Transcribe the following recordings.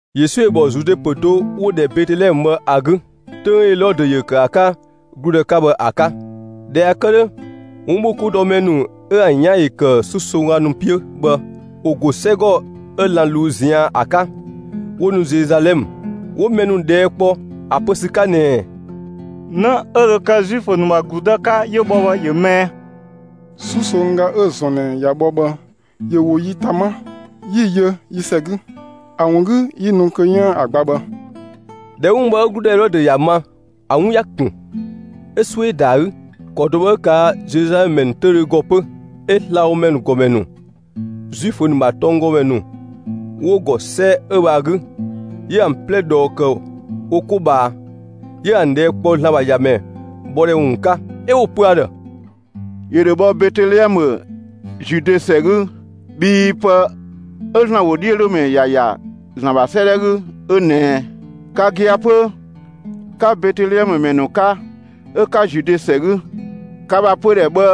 Yesu ‑yö ‑bhɔ Zude ‑pö do 'wo‑ ‑dhɛ Betelɛmë ‑a 'gü, 'töng 'ö Elɔdö ‑yö ‑kë ‑a 'ka ‑gludë 'ka bhë ‑a 'ka. ꞊Dhɛ ꞊ya kë 'dhö, 'wunbhokoudɔmɛ ‑nu 'ö ‑an 'yan ‑yö ‑kë 'susongga ‑nu 'piö bhë, ‑wo ‑go 'sɛgɔ 'ö lan‑ ꞊luu'‑ ꞊zian' ‑a 'ka, 'wo nu Zeluzalɛmë. 'Wo mɛ ‑nu ꞊dhɛɛ' kpɔ ‑a pö ‑sü 'ka ꞊nɛɛ: «'Në 'ö dho kë Zuifö ‑nu ‑bha ‑gludë 'ka 'yö bhɔ bhë, ‑yö më ꞊ɛ? 'Susongga 'ö‑ ‑zɔn ꞊nɛ ꞊ya bhɔ bhë ‑yö ‑wo yi ‑ta 'ma, 'yi‑ yö yi ‑sɛ 'gü. ‑A ‑wun 'gü 'yi nu kö 'yiën‑ ‑a gba bhë.» ꞊Dhɛ 'wun bhë 'ö ‑gludë Elɔdö ‑ya ma, ‑a 'wun ‑ya ‑kun, 'ö 'suö ‑yö ‑da ‑a 'gü. ‑Kɔ do bhë 'ö ꞊kaa' Zeluzalɛmë ‑mɛ ‑nu 'töüdhö ‑gɔ 'pö. 'Ö slabhomɛ ‑nu ‑gɔmɛ ‑nu, Zuifö ‑nu ‑bha tɔnggɔmɛ ‑nu 'wo‑ ‑gɔ 'sɛ 'ö bhë ‑a 'gü, 'yö ‑an 'plɛ ꞊dhɔɔ ‑kë wo 'ko ꞊bhaa, 'yö ‑an ꞊dhɛɛ' kpɔ ‑Zlan ‑bha ‑Yamɛ bhɔ ‑dhɛ ‑wun 'ka. 'Ö 'wo‑ pö ‑a ‑dhë: «‑Yö ‑dho bhɔ Betelɛmë, Zude ‑sɛ 'gü. Bhii pë 'ö ‑Zlan ‑wodhiölomɛ ‑ya ‑ya ‑Zlan ‑bha 'sëëdhɛ 'gü 'ö ꞊nɛɛ: Ka gia‑ 'pö, 'ka Betelɛmë ‑mɛ ‑nu 'ka, 'ö 'ka Zude ‑sɛ 'gü, ka ‑bha pödhɛ bhë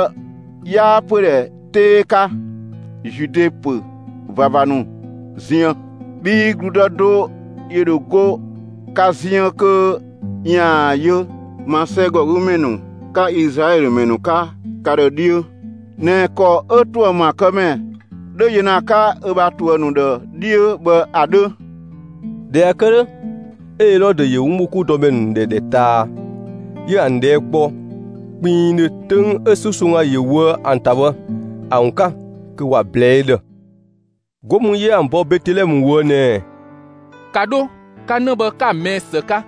'yaa pödhɛ 'tee 'ka Zude ‑pö ꞊vava ‑nu ziën. Bhii ‑gludë do ‑yö ‑dho go ka ziën kö ‑yaan yö ma 'sɛgɔgümɛ ‑nu 'ka Izlaɛlö ‑mɛ ‑nu 'ka ka ‑dhë 'dhiö ꞊nɛ ‑kɔ 'ö ‑tuë ‑maakëmɛ 'dhö yö ‑na ‑a 'ka ö bha ‑tuë ‑nu ‑dhë 'dhiö bhë ‑a 'dhö.» ꞊Dhɛ ꞊ya kë 'dhö, 'ö Elɔdö ‑yö 'wunbhokoudɔmɛ ‑nu ‑dhɛ ‑dhɛ ꞊taa, 'yö ‑an ꞊dhɛɛ' kpɔ kpinngdhö 'töng 'ö 'susongga ‑yö ꞊woë' ‑an ‑ta bhë ‑a ‑wun 'ka kö ‑wa ꞊blɛɛ'‑ ö ‑dhë. 'Go mü 'yö ‑an bɔ Betelɛmë ꞊woë' ꞊nɛɛ: «‑Ka 'dho 'ka 'në 'ö bhë 'ka‑ ꞊mɛɛ' ‑së 'ka!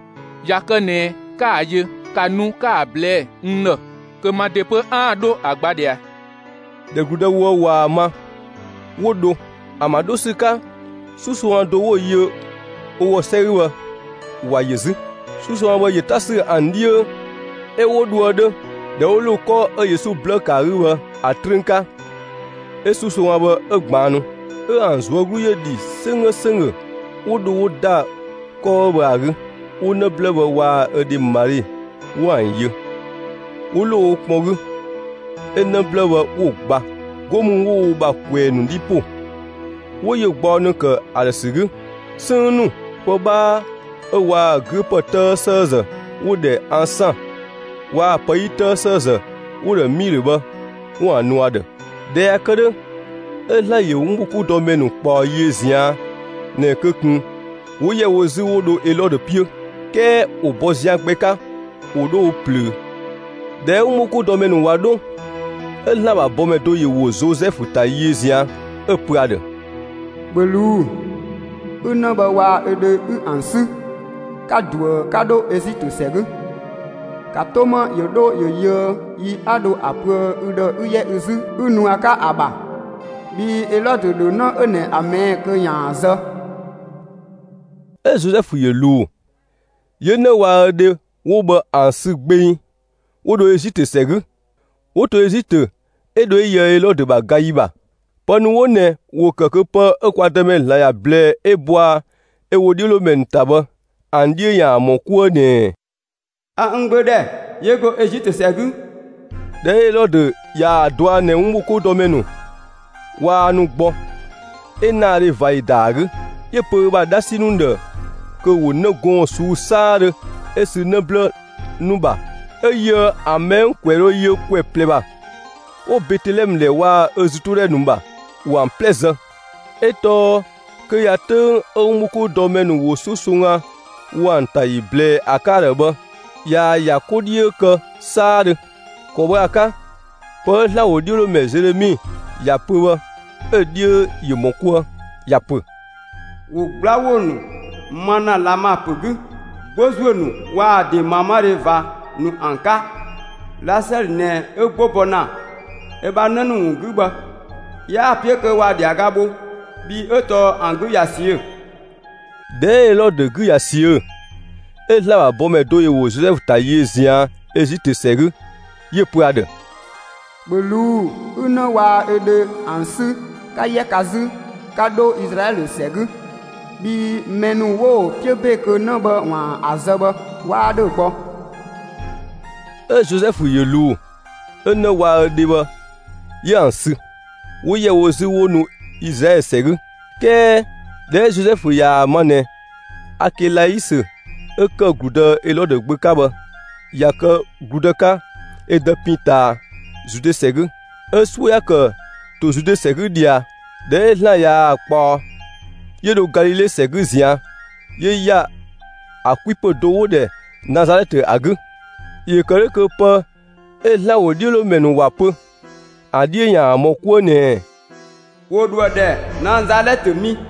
꞊Ya kë ꞊nɛ 'ka‑ yö, ‑ka nu 'ka‑ ꞊blɛɛ'‑ n ‑dhë kö ma ‑de 'pö 'aan‑ 'dho ‑a gba ꞊dhia.» ꞊Dhɛ ‑gludë ‑wo 'ö bhë ꞊waa‑ ma, 'wo dho. ‑An ‑bha 'dho ‑sü 'ka, 'susongga do 'wo‑ yö wo ‑gɔ 'sɛ 'gü bhë, ‑wa yö 'zü. 'Susongga bhë ‑yö 'ta ‑sü ‑an 'dhiö 'ö 'wo dhoë 'dhö. ꞊Dhɛ 'wo ‑lo 'kɔ 'ö Yesu 'blë ‑kë ‑a 'gü bhë ‑a 'trüün 'ka, 'ö 'susongga bhë 'ö ꞊gbaannu. 'Ö ‑an ꞊zuö' 'glu ‑yö ‑dhi 'sönggö ‑sönggö. 'Wo dho 'wo ‑da 'kɔ 'ö bhë ‑a 'gü, 'wo 'në 'blë bhë waa‑ ö dhe Mali 'wo ‑an yö, 'wo ‑lo wo kpɔn 'gü, 'ö 'në 'blë bhë 'wo‑ gba. 'Go mü 'wo wo ‑bha ꞊kwɛɛ‑ ‑nu 'dhi ‑po, 'wo yö gbaɔ ‑nu kë ‑a ‑dhë ‑sü 'gü: 'Sënng ‑nu, pë 'bhaa 'ö waa‑ 'güö ‑pë 'tëë ‑sëëzë 'wo‑ ‑dhɛ ansaan waa‑ pë 'yi 'tëë ‑sëëzë 'wo‑ ‑dhɛ 'miilö bhë, 'wo ‑an nu ‑a ‑dhë. ꞊Dhɛ ꞊ya kë 'dhö, 'ö ‑Zlan ‑yö 'wunbhokoudɔmɛ ‑nu ꞊kpaɔ yiö ꞊zian' ꞊nɛ kö ꞊kun 'wo ‑yɛ wo 'zü 'wo dho Elɔdö 'piö, 'kɛɛ 'wo bɔ zian gbɛ 'ka 'wo dho wo ꞊plöö. ꞊Dhɛ 'ö 'wunbhokoudɔmɛ ‑nu ꞊wa 'dho, 'ö ‑Zlan ‑bha bɔmɛ do ‑yö ‑wo Zozɛfu ‑ta yiö ꞊zian', 'ö‑ pö ‑a ‑dhë: «‑Bhö ꞊luu'‑, 'ü 'në bhë waa‑ ö dhe 'ü ‑an 'sü, 'ka ꞊duë 'ka 'dho Ezitö ‑sɛ 'gü! ‑Ka 'to 'ma ‑yö 'dho ‑yö yöë yi 'a dho ‑a pöë ü ‑dhë 'ü 'yɛ ü 'zü 'ü nu ‑a 'ka ‑a ‑bha! Bhii Elɔdö ‑dho 'në 'ö ꞊nɛ ‑a ꞊mɛɛ' kö ‑yaan ‑a zë.» 'Ö Zozɛfu ‑yö ꞊luu, 'yö 'në waa‑ ö dhe 'wo bhë ‑an sü gbeng, 'wo dho Ezitö ‑sɛ 'gü. 'Wo to Ezitö 'ö dho 'ö yöë Elɔdö ‑bha ga ‑yi ‑bha. Pë ‑nu 'wo ꞊nɛ ‑wo ‑kë kö pë 'ö kwa Dëmɛ ‑Zlan ‑ya ꞊blɛɛ 'ö bɔa ö ‑wodhiölomɛ ‑nu ‑ta bhë ‑an 'dhiö ‑yaan ‑mɔ 'kuë ꞊nɛɛ: A n Gbö ‑dhɛ, 'yö go Ezitö ‑sɛ 'gü. ꞊Dhɛ 'ö Elɔdö ꞊yaa‑ dɔa ꞊nɛ 'wunbhokoudɔmɛ ‑nu waa nu gbɔ, 'ö ‑naadhe ꞊va ‑yö ‑da ‑a 'gü. 'Yö‑ pö ö bha 'dhasi ‑nu ‑dhë kö ‑wo 'në gɔɔn‑ ꞊suu'‑ 'saadhö 'ö sü 'në 'blë ‑nu ‑bha 'ö yöë ‑an ‑mɛ 'ö ‑an ‑kwɛ dho yö ‑kwɛ ꞊plɛ ‑bha, 'wo Betelɛmë ‑dhɛ waa‑ ‑a ‑zütodhɛ ‑nu ‑bha, ‑wo ‑an 'plɛ zë. 'Ö tɔɔ kö ꞊ya 'töng 'ö 'wunbhokoudɔmɛ ‑nu ‑wo 'susongga ‑wo ‑an ‑ta ‑yi ꞊blɛɛ ‑a 'ka ‑a ‑dhë bhë ꞊yaa‑ ‑ya 'ko 'dhiö kë 'saadhö. ‑Kɔ bhë ‑a 'ka, pë 'ö ‑Zlan ‑wodhiölomɛ Zelemi ‑ya pö bhë, 'ö‑ 'dhiö ‑yö ‑mɔ 'kuë. ‑Ya ‑pö: ‑Wo 'gbla ‑wo ‑nu ma ‑na Lama ‑pö 'gü, 'gbo ‑zuö ‑nu waa‑ ‑de ꞊maamadhe ꞊va ‑nu ‑an 'ka. Lasɛlö ꞊nɛ 'ö 'gbo bɔ ‑na ö ‑bha 'në ‑nu ‑wun 'gü bhë; 'yaa‑ 'piö kö ‑wa ‑dhiaga bho, bhii 'ö tɔɔ ‑an 'gü ꞊ya ꞊siö'‑. ꞊Dhɛ 'ö Elɔdö 'gü ꞊ya ꞊siö'‑, 'ö ‑Zlan ‑bha bɔmɛ do ‑yö ‑wo Zozɛfu ‑ta yiö ꞊zian' Ezitö ‑sɛ 'gü, 'yö‑ pö ‑a ‑dhë: «‑Bhö ꞊luu'‑, 'ü 'në waa‑ ö dhe ‑an 'sü, 'ka 'yɛ ka 'zü 'ka 'dho Izlaɛlö ‑sɛ 'gü, bhii mɛ ‑nu 'wo‑ 'piö ‑be kö 'në bhë ‑waan ‑a zë bhë 'waa ‑dhö gbɔ.» 'Ö Zozɛfu ‑yö ꞊luu, 'ö 'në waa‑ ö dhe bhë 'yö ‑an sü, 'wo ‑yɛ wo 'zü 'wo nu Izlaɛlö ‑sɛ 'gü. 'Kɛɛ ꞊dhɛ 'ö Zozɛfu ꞊yaa‑ ma ꞊nɛ, Akelaisö, 'ö ‑kë ‑gludë Elɔdö gbö 'ka bhë, ꞊ya kë ‑gludë 'ka ö dë pin ꞊taa Zude ‑sɛ 'gü, 'ö 'suö ‑ya ‑kë ‑to Zude ‑sɛ 'gü ꞊dhia. ꞊Dhɛ 'ö ‑Zlan ꞊yaa‑ ꞊kpaɔ, 'yö dho Galile ‑sɛ 'gü ꞊zian', 'yö ‑ya ‑a 'kwipö do 'wo‑ ‑dhɛ Nazalɛtë ‑a 'gü. ‑Yö ‑kë 'dhö kö pë 'ö ‑Zlan ‑wodhiölomɛ ‑nu ‑wa pö, ‑a 'dhiö ‑yaan ‑mɔ 'kuë ꞊nɛɛ: ‑Wo ‑dho ‑a ‑dhɛ Nazalɛtë mi.